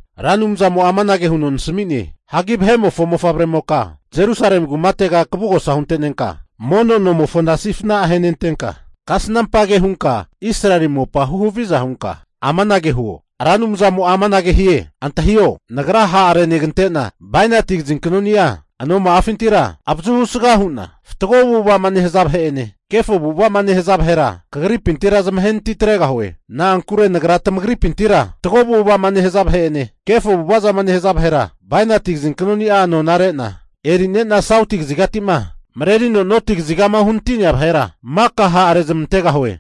Ra Anumzamo'a amanage huno nasami'ne, Vahe'mofo mofavremoka, Jerusalemi kumatega kavugosa hunte'nenka mono nomofona sifna ahenentenka, kasnampage hunka Israeli mopa huhaviza hunka, amanage huo, Ra Anumzamo'a amanage hie, antahio, Nagra ha'renegante'na bainati kazinknoni'a anoma'afintira avazuhu saga hu'na fatgo avu'ava'ma nehaza vahe'ene kefo avu'avazama nehaza vahera kagripintira zamahenati atregahue. Na'ankure Nagra tamagripintira fatgo avu'ava'ma nehaza vahe'ene kefo avu'ava zama nehaza vahera bainati kazinknoni'a anore'na eri'nena sauti kazigati'ma marerino noti kazigama uhanati'nea vahera maka hara rezmantegahue.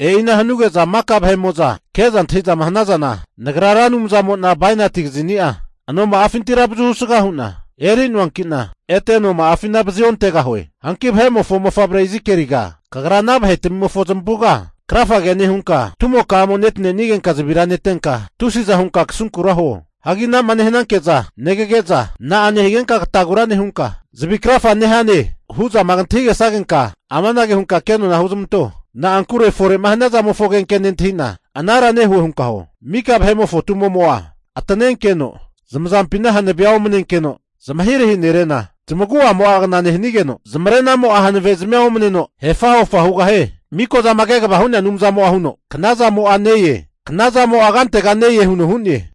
E'ina hanuge'za maka vahe'mo'zama ke'za antahi'zama hanazana, Nagra Ra Anumzamo'na bainati kazinia anoma'afintira avazuhu sga hu'na eri'noankina ete anoma'afina vazi ontegahue. Hagi vahe'mofo mofavre Izikieliga, kagra ana vahetamimofo zamavuga krafagea nehunka, tumoka'amo'a netanenigenka zavira netenka tusiza hunka kasunkura huo. Hagi ana'ma nehananke'za negage'za, na'a nehigenka katagura nehunka zavi krafa nehane? hu'zama kantahigesagenka, amanage hunka kenona huzmanto, na'ankure fore'ma hania zamofo agenke nentahi'na anara nehue hunka huo. Mika vahe'mofo tumo'mo'a atanenkeno, zamazampina hanavea omanenkeno zamahirahi nerena, zamagu'amo'a kna nehanigeno, zamarenamo'a hanavezmia omaneno hefa'hofa hugahie. Mikozama kegavama hu'nea Anumzamo'a huno, knazamo'a ne-e. Knazamo'a kantega ne-e huno hu'ne!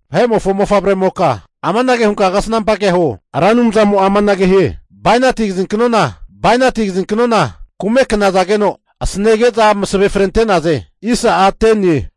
Vahe'mofo mofavremoka amanage hunka kasnampa kea huo, Ra Anumzamo'a amanage hie, bainati kazinknona, kume knazageno asanetege'za masave frente'naze.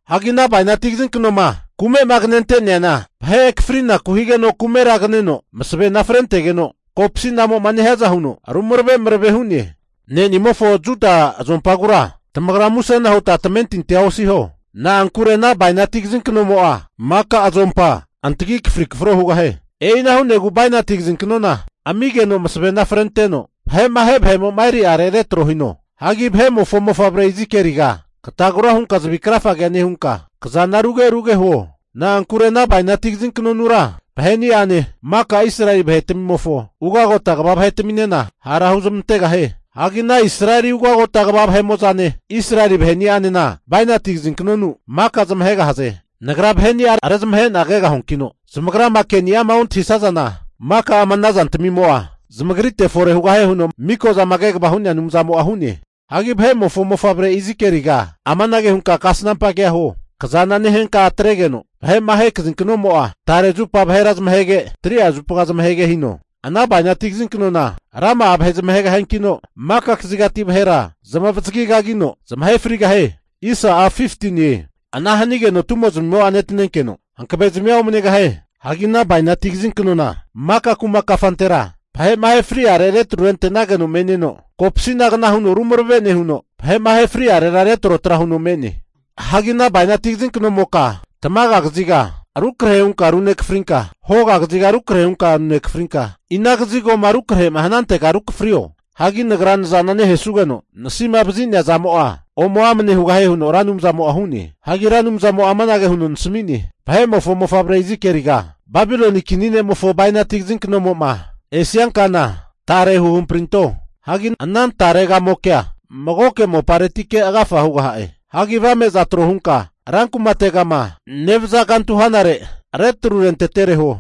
Hagi ana bainati kazinknoma kumema kanente'neana vahe akafrinaku higeno kumera kaneno masavena frentegeno, kopsinamo'ma nehiaza huno ru marave marave hu'ne. Ne'nimofo Juda azompagura tamagra musena huta tamentintia osiho! Na'ankure ana bainati kazinknomo'a maka azompa antagi akafri kafro hugahie. E'ina hu'negu bainati kazinknona amigeno masavena frenteno vahe'ma ahe vahe'mo'ma eri'are retro hunte'ne. Hagi vahe'mofo mofavre Izikieliga, katagura hunka zavi krafa nehunka kazana ruge ruge huo. Na'ankure ana bainati kazinknonura vahe'ni'ane, maka Israeli vahetamimofo ugagota kva vahetaminena hara huzmantegahie. Hagi ana Israeli ugagota kva vahe'mo'zane, Israeli vaheni'anena bainati kazinknonu maka zamahegahaze. Nagra vahe'ni'a rezamahe'na kegahuankino, zamagrama keni'ama ontahisazana maka ama ana zantmimo'a zamagrite fore hugahie huno Miko'zama Kegvama Hu'nea Anumzamo'a hu'ne. Hagi vahe'mofo mofavre Izikieliga, amanage hunka kasnampa kea huo. Kazana nehenka atregeno vahe'ma ahe kazinknomo'a tare zupa vahera zamahege, 3'a zupa zamahege hino. Ana bainati kazinknom'a rama'a vahe zamahegahiankino, maka kazigati vahera zamavazagi kagino zamahe frigahie. Ana hanageno tumo'zamimo'a netanenkeno, hankavezmia omanegahie. Hagi ana bainati kazinknona maka kuma kafantera vahe'ma ahe fri'are retrurente'nageno me'neno kopsinagna huno rumarave nehuno vahe'ma ahe fri'are retrotra huno me'ne. Hagi ana bainati kazinknomoka tamaga kaziga rukrahe hunka runekafrinka, hoga kaziga rukrahe hunka runekafrinka, ina kazigo rukrahe'ma hanantega rukafrio. Hagi Nagra nazana nehesugeno, nasima vazi'nea zamo'a ome amne hugahie huno Ra Anumzamo'a hu'ne. Hagi Ra Anumzamo'a amanage huno nasami'ne, Vahe'mofo mofavre Izikieliga, Babiloni kini ne'mofo bainati kazinknomo'ma esiankana tare huhamprinto. Hagi ana tare kamokea magoke moparetike agafa hugaha'e. Hagi avame'za trohunka rankumategama agafa huno'ma nevaza kantu hanare retru rentetere huo.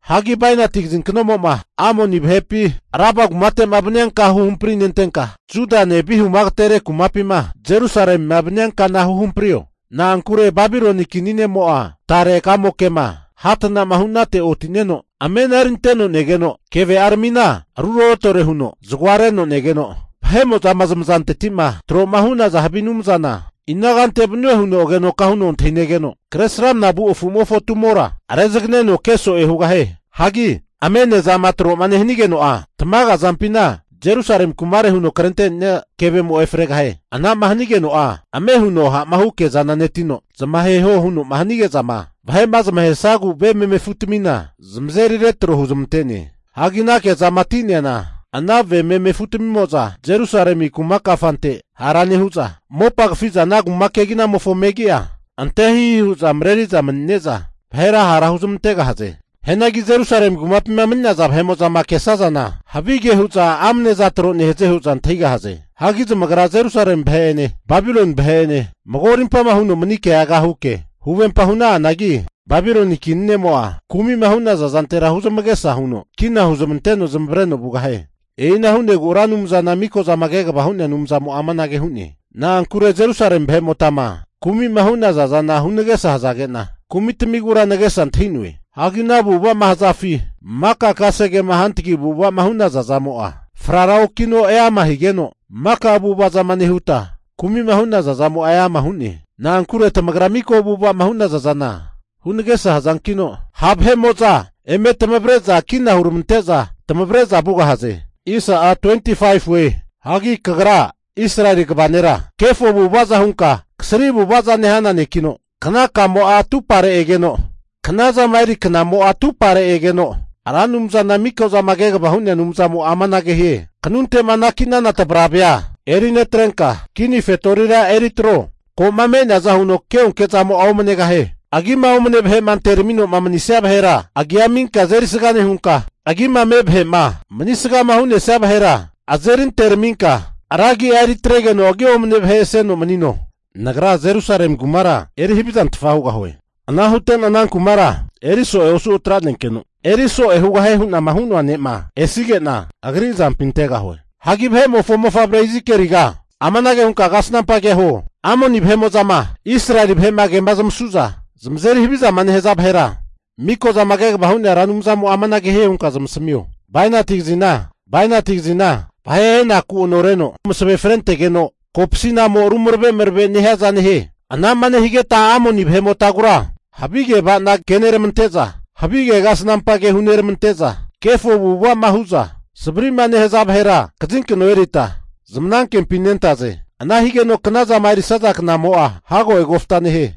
Hagi bainati kazinknomo'ma Amoni vahepima Raba kumate'ma vania ka huhamprinentenka, kazinknomo'ma Judane vihumo'ma agatere kumapima Jerusalemima vanianka huhamprio. Na'ankure Babiloni kini ne'mo'a tare kamokema hatana'ma hunate otineno, amena erinteno negeno, keve'aramina ruroretore huno zagoa reno negeno, vahe'mo'zama zamazanteti'ma tro'ma hu'naza havi anumzana ina kante vanue huno agenoka huno antahi negeno, Kresramanama vu afu'mofo tumora rezaganeno keso'e hugahie. Hagi amenezama tro'ma nehanigeno'a, tamaga azampina Jerusalemi kumare huno krente'nenia kevemo efregahie. Ana'ma hanigeno'a ame huno ha'ma hu kezana netino, zamaheho huno'ma hanige'zama vahe'ma zamahesagu ve meme afutamina zamazeri retro huzmante'ne. Hagi ana kezama ati'neana ana ve meme afutamimo'za Jerusalemi kuma kafante hara nehu'za, mopa kafiza ana kuma keginamofo megia ante hihi hu'za mareriza mani'neza kahama renafe hu'za mareri'zana za'za zafareti tro hu'za renafe kahana hu'za mareri'za vahera hara huzmantegahaze. Hianagi Jerusalemi kumapima mani'naza vahe'mo'za kesazana, havige'za hu'za ameneza tro nehaze hu'za antahigahaze. Hagi zamagra Jerusalemi vahe'ene Babiloni vahe'ene mago rimpama huno mani' keaga huke huvempa huna'anagi, Babiloni kini ne'mo'a kumima hu'naza zantera huzamagesa huno kina huzmanteno zamavareno vugahie. E'ina hu'negu Ra Anumzana Miko'zama Kegava Hu'nea Anumzamo'a amanage hu'ne. Na'ankure Jerusalemi vahe'motama kumi'ma hu'naza zana hunagesa hazage'na, kumitamigura nagesa antahi'noe. Hagi ana avu'ava'ma hazafi maka kasegema hantagi avu'ava'ma hu'naza zamo'a, frara okino eama higeno maka avu'ava zama nehuta kumi'ma hu'naza zamo'a eama hu'ne. Na'ankure tamagra mika avu'ava'ma hu'naza zana hunagesa hazankino, ha' vahe'mo'za eme tamazeri'za kina huramante'za tamavre'za vugahaze. Hagi kagra Israeli kva nera kefo avu'avaza hunka kasri avu'avaza nehana nekino, knaka'amo'a atuparega egeno, knazama eri knamo'a atumpare egeno, Ra Anumzana Mikozama kegavama Hu'nea Anumzamo'a amanage hie, Kanunte'ma anaki'nana tavravea eri netrenka, kini fetorira eritro. Ko'ma me'neaza huno keonke zamo'a omanegahie. Agima omne vahe'ma anteramino'ma mani'nesia vahera agia aminka azerisga nehunka, agima me' vahe'ma manisgama hu'nesia vahera azeri anteraminka ra agi'a eritregeno agi omne vahe aseno manino. Nagra Jerusalemi kumara eri haviza nehu'na eri havizantfa hugahue. Ana hutena ana kumara eri so'e osu atranenkeno, eri so'e hugahie hunama hu'noa ne'ma esige'na, agri azampi antegahue. Hagi vahe'mofo mofavre Izikieliga amanage hunka kasnampa kea huo, Amoni vahe'mo'zama Israeli vahe'ma kema zamasu'za zamazeri havizama nehaza vahera Mikozama Kegavama Hu'nea Ra Anumzamo'a amanage hie hunka zamasamio, bainati kazine, bainati kazimo'a vahe ahenaku anoreno masave frentegeno kopsinamo rumarave marave nehiaza nehie. Ana'ma nehigeno'a Amoni vahe'motagura havige ava'na keneramante'za havige kasnampa ke huneramante'za kefo avu'ava'ma hu'za savri'ma nehaza vahera kazinkno erita zmanankempi nentaze. Ana higeno knazama erisaza knamo'a hago egofta nehie.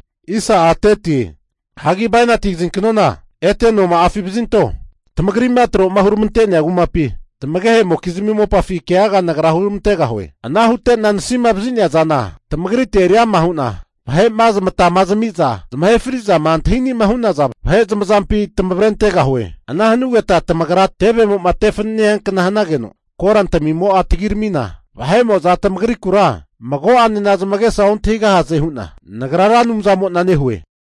Hagi bainati kazinknona ete anoma'afi vazinto. Tamagri'ma tro'ma huramante'nea kumapi, tamagehe'mokizmi mopafi keaga Nagra huramantegahue. Ana hute'na nasima vazi'nea zana tamagritera eri ama hu'na, vahe'ma zamatama zami'za zamahe fri'zama antahi ani'ma hu'naza vahe zamazampi tamavre antegahue. Ana hanugeta tamagra tevema tevemo'ma te fanene hiankna hanageno korantmimo'a tagiramina, vahe'mo'za tamagrikura mago'anena zamagesa ontahigahaze hu'na Nagra Ra Anumzamo'na nehue.